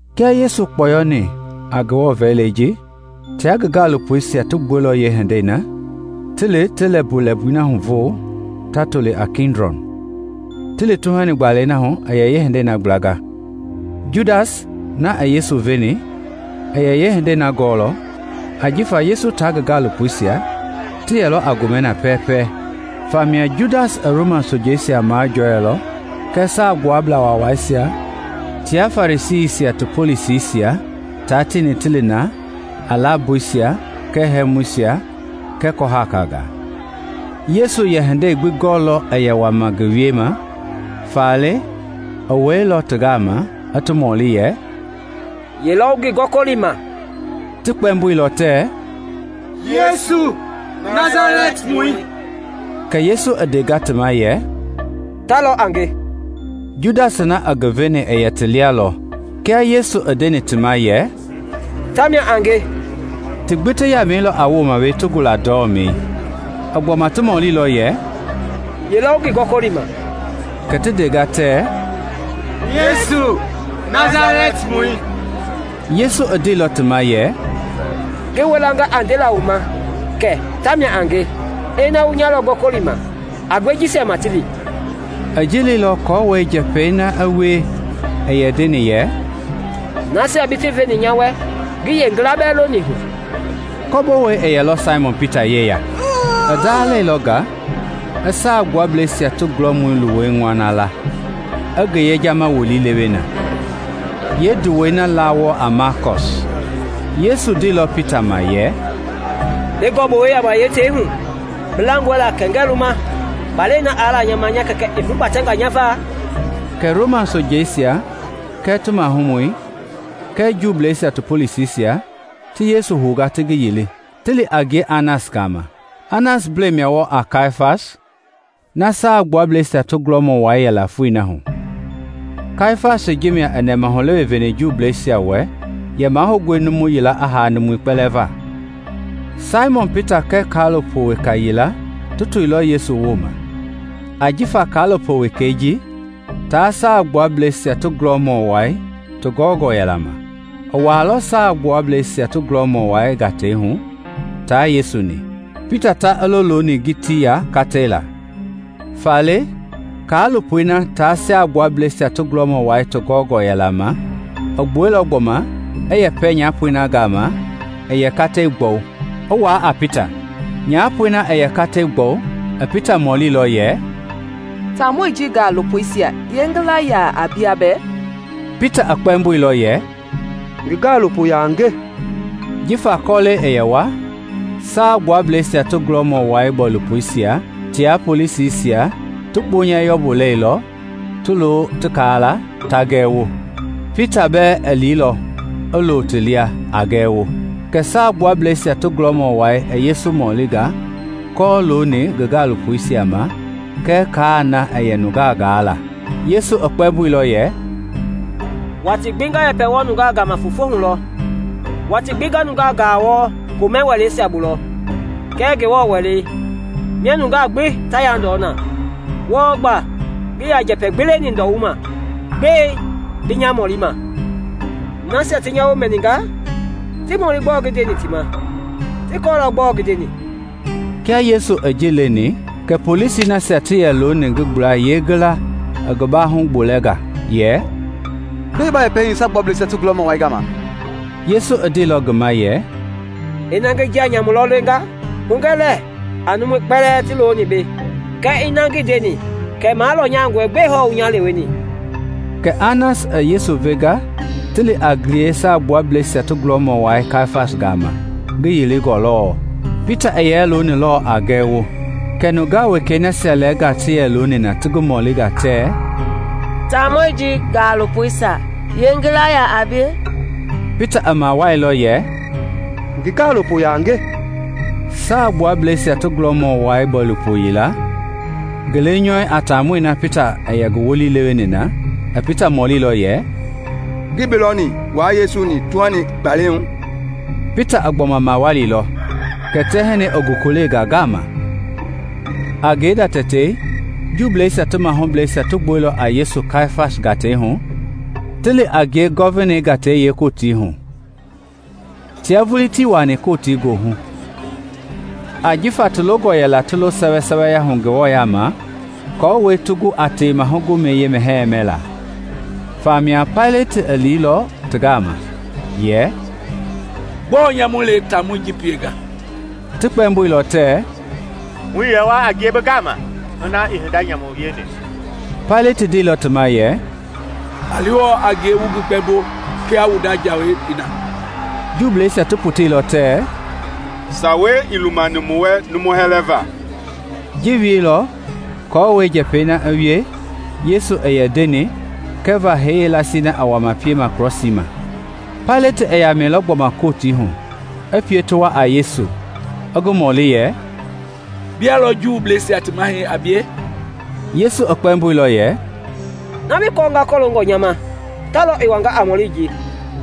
Kia Yesu i kpɔyɔni a Ngewɔ vɛlilei ji, tia ngi gaalopoisia ti gbuɛilɔ yeehindei na ti li ti lɛmbui na huvo ta toli a Kidlɔn, ti li tuhani gbaala yila hu i yeehindei na. Judas na i Yesu veni i yɛ yeehindei na gɔɔlɔ ajifa Yesu tia ngi gaalopoisia ti yɛlɔ a gomɛ na pɛɛpɛ. Famia Judas i Roma sojangaa majɔɛilɔ kɛɛ Saagbuablaa Waawaisia tia Farisiisia ti polisisia tia tieni ti li na a lamboisia kɛɛ hɛmuisia kɛɛ kɔhakangaa. Yesu i yɛ hindei gbi gɔɔlɔ i yɛ wama ngi wiema, faale i wɛilɔ ti gama i ti mɔli yɛ, “Ye lɔ wu ngi gɔkɔlima?” Ti kpɛmboilɔ tɛɛ, “Yesu Nasalɛtimɔi.” Kɛ Yesu i ndenga ti ma yɛ, “Ta lɔ a nge.” Judas na i ngi veni i yɛ ti lia lɔ. Kia Yesu i ndeni ti ma yɛ, “Tamia a nge,” ti gbi ti yamɛilɔ a wooma wee ti gula ndɔmɛi. I gbɔma ti mɔlilɔ yɛ, “Ye lɔ wu ngi gɔkɔlima?” Kɛ ti ndenga tɛɛ, “Yesu Nasalɛtimɔi.” Yesu i ndeilɔ ti ma yɛ, “Ngi wilanga a ndela wu ma kɛ tamia a nge. Ina wu nya lɔ gɔkɔlima, a gbe jisia ma ti li.” (I ji leilɔ aako njɛpɛi na i wie i yɛ ndeni yɛ, “Nasia bi ti veni nya wɛ ngii yeengila bɛɛ loni hu.”) Kɔbowei i yɛlɔ Saimɔn Pita yeya. I ndalɛilɔ nga i Saa Gbuablɛisia ti gulɔmɔi luwɔi ŋɔna la, i ngi yejama wolii lewe na. Yeenduwɔi na laa wɔɔ a Malkɔs. Yesu ndeilɔ Pita ma yɛ, “Bi gɔ-bowɛi yama yeetei hu. Bi langɔe la kɛ ngɛɛ luma kpalɛi na aa la nya ma nya Kɛkɛ i hugbatɛnga nya va?” Kɛ Roma sojeisia kɛɛ ti mahumɔi kɛɛ Juuisia ti polisisia ti Yesu hounga ti ngi yili. Ti liilɔ a ngie Anas gama. Anas mblɛi mia wɔɔ a Kayafasi na Saagbuablɛisia ti gulɔmɔ wai yɛla foi na hu. Kayafasi ji mia i yɛ nɛmahulewe veni Juuisia wɛ yɛ mahoungɔe numu yila i haa numui kpɛlɛɛ va. Saimɔn Pita kɛɛ kaalopo weka yila ti toilɔ Yesu wooma. Jifa kaalopo wekei ji tia Saagbuablɛisia ti gulɔmɔ wai ti gɔngɔ yɛla ma i wuailɔ Saagbuablɛisia ti gulɔmɔ wai gatei hu tia Yesu-ni. Pita ta i lo looni ngitii ya katei laa. Faale kaalopoi na tia Saagbuablɛisia ti gulɔmɔ wai ti gɔngɔ yɛla ma i gbuailɔ gbɔma i yɛpɛ nyapoi na gama i yɛ katei gbɔwu, i wuaa a Pita. Nyapoi na i yɛ katei gbɔwu i Pita mɔlilɔ yɛ, “Taamɔi ji gaalopoisia yeengila yaa a bia bɛɛ?” Pita kpɛmboilɔ yɛ, “Ngi gaalopo yaa a nge.” Jifa kɔlɛi i yɛ wa, Saagbuablɛisia ti gulɔmɔ wai bɔilopoisia tia polisisia ti kpunyɛ yɔmbui lailɔ, ti lo ti kaala ta gɛwo. Pita bɛɛ i liilɔ, i lo ti lia, a gɛwo. Kɛ Saagbuablɛisia ti gulɔmɔ wai i Yesu mɔlimɔlinga kɔlooni ngi gaalopoisia ma kɛɛ kaai na i yɛ nungaa gaa la. Yesu i kpɛmboilɔ yɛ, “Watii gbi nga yɛpɛ wɔɔ nungaa gama fofo hu lɔ; watii gbi nga nungaa gaa wɔɔ komɛ wɛleisia bu lɔ kɛɛ Ngewɔ Wɛlei, mia nungaa gbi ta yandɔɔ na; wɔɔ gba ngii yaa njɛpɛ gbi leni ndɔwuma. Gbɛe bi nya mɔlima? Nasia ti nya woo mɛninga, ti mɔli gbɔɔ ngi ndeni ti ma; ti kɔɔlɔ gbɔɔ ngi ndeni.” Kia Yesu i ji leni, kɛ polisi nasia ti yɛ looni ngi gbla yeengila i ngi baahu gbolɛnga yɛ, “Gbɛe ba yɛpɛ hii Saagbuablɛisia ti gulɔmɔ wai gama?” Yesu i ndeilɔ ngi ma yɛ, “Ina ngi njia nyamu lɔ lenga, hugɛ lɛ a numui kpɛlɛɛ ti looni bei. Kɛɛ ina na ngi ndeni kama lɔnyangɔe gbɛe hɔɔ bi nya leweni?” Kɛ Anas i Yesu venga ti li a ngie Saagbuablɛisia ti gulɔmɔ wai Kayafasi gama, ngi yilingɔ lɔɔ. Pita i yɛ loonilɔ lɔɔ a gɛwo. Kɛ nungaa wekei nasia lɛɛnga ti yɛ looni na ti ngi mɔlinga tɛɛ, “Taamɔi ji gaalopoisia yeengila yaa a bie?” Pita i mawalilɔ yɛ, “Ngi gaalopo yaa a nge.” Saagbuablɛisia ti gulɔmɔ wai bɔilopo yila, ngi lenyɔu a taamɔi na Pita i yɛ ngi wolii leweni na, i Pita mɔlilɔ yɛ, “Ngii bi lɔni wua Yesu-ni tuhani gbalei hu?” Pita i gbɔma mawalilɔ; kɛ tɛhinɛi i gokolenga ngaama. A ngenda tɛtei Juuisia ti mahublɛisia ti gbuɛilɔ a Yesu Kayafasi gatei hu ti li a ngie Gɔvinei gatei yeekootii hu. Tia vulii tii wuaani kɔtii goohu ajifa ti longɔ yɛla ti lo sɛwɛsɛwɛya hu Ngewɔ yaama aako ti gu a Tewema Gomɛi yeemɛhɛi mɛla. Famia Paileti i liilɔ ti gama yɛ, “Gbɔɔ nyamu le taamɔi ji pienga?” Ti kpɛmboilɔ tɛɛ, “Muii yɛ wa a ngie bi gama ina ii hinda nyamu wieni.” Paileti ndeilɔ ti ma yɛ, “A li hɔɔ a ngie wua yekpe wu ngi gbɛmbo kia wu nda jawei i na.” Juuisia ti poteilɔ tɛɛ, “Sawei ii lumani mu wɛ numu hɛlɛva.” (Ji i wieilɔ aako njɛpɛi na i wie Yesu i yɛ ndeni kɛva hee yeelasii na i wama piema krɔsii ma.) Paileti i yamɛilɔ gbɔma Kotii hu, i pie ti wa a Yesu, i ngi mɔli yɛ, “Bia lɔ Juuisia ti mahɛi a bie?” Yesu i kpɛmboilɔ yɛ, “Na bi kɔɔnga kɔloongɔ nya ma ta lɔ i wanga a mɔli ji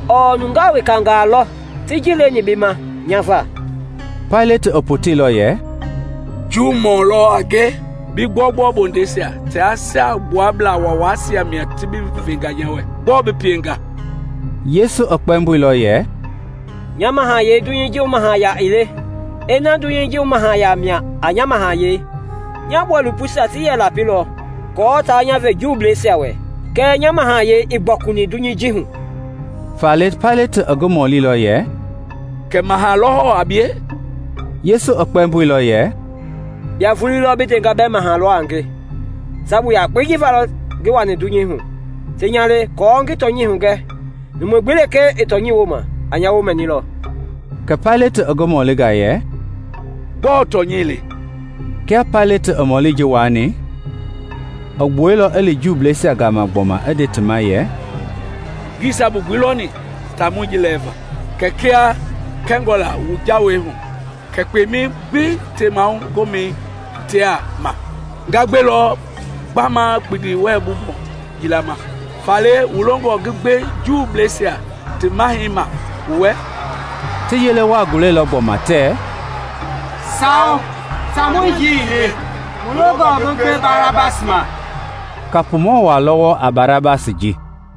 ɔɔ nungaa wekangaa lɔ ti ji leni bi ma nya va.” Paileti i poteilɔ yɛ, “Juumɔ lɔ a nge? Bi gbɔugbɔu bondeisia tia Saagbuablaa Waawaisia mia ti bi venga nya wɛ; gbɔɔ bi pienga?” Yesu i kpɛmboilɔ yɛ, “Nya mahayɛi dunyei ji hu mahaya ii le; kiaa dunyei ji hu mahaya mia a nya mahayɛi, nya bɔilopoisia ti yɛ lapilɔ aako taa nya ve Juuisia wɛ; kɛɛ nya mahayɛi ii gbɔkuni dunyei ji hu.” Faale Paileti i ngi mɔlilɔ yɛ, “Kɛ maha lɔ hɔɔ a bie?” Yesu i kpɛmboilɔ yɛ, “Bia vulii lɔ bi ndenga bɛɛ maha lɔ a nge. Sabu yakpei ji va lɔ ngi wani dunyei hu, ti nya le aako ngi tɔnyɛi hugɛ. Numu gbi lekee i tɔnyɛi wooma a nya woo mɛnilɔ.” Kɛ Paileti i ngi mɔlinga yɛ, “Gbɔɔ tɔnyɛi le?” Kia Paileti i mɔli ji wuaani, i gbuɛilɔ i li Juuisia gama gbɔma i nde ti ma yɛ, “Ngii sabu gbi lɔni taamɔi ji lɛɛva. Kɛɛ kia kɛngɔ la wu jawei hu Kɛ kpeima gbi tewema gomɛi hitea ma, nga gbe lɔ gbama kpindi wɛlɛbu mɔ yila ma. Faale wu longɔ ngi gbe Juuisia ti mahɛi ma wu wɛ?” Ti yele waa gulailɔ gbɔma tɛɛ, “Sawo! Taamɔi ji ii le; mu longɔ bi gbe Barabasi ma.” Kapumɔ waa lɔ wɔɔ a Barabasi ji.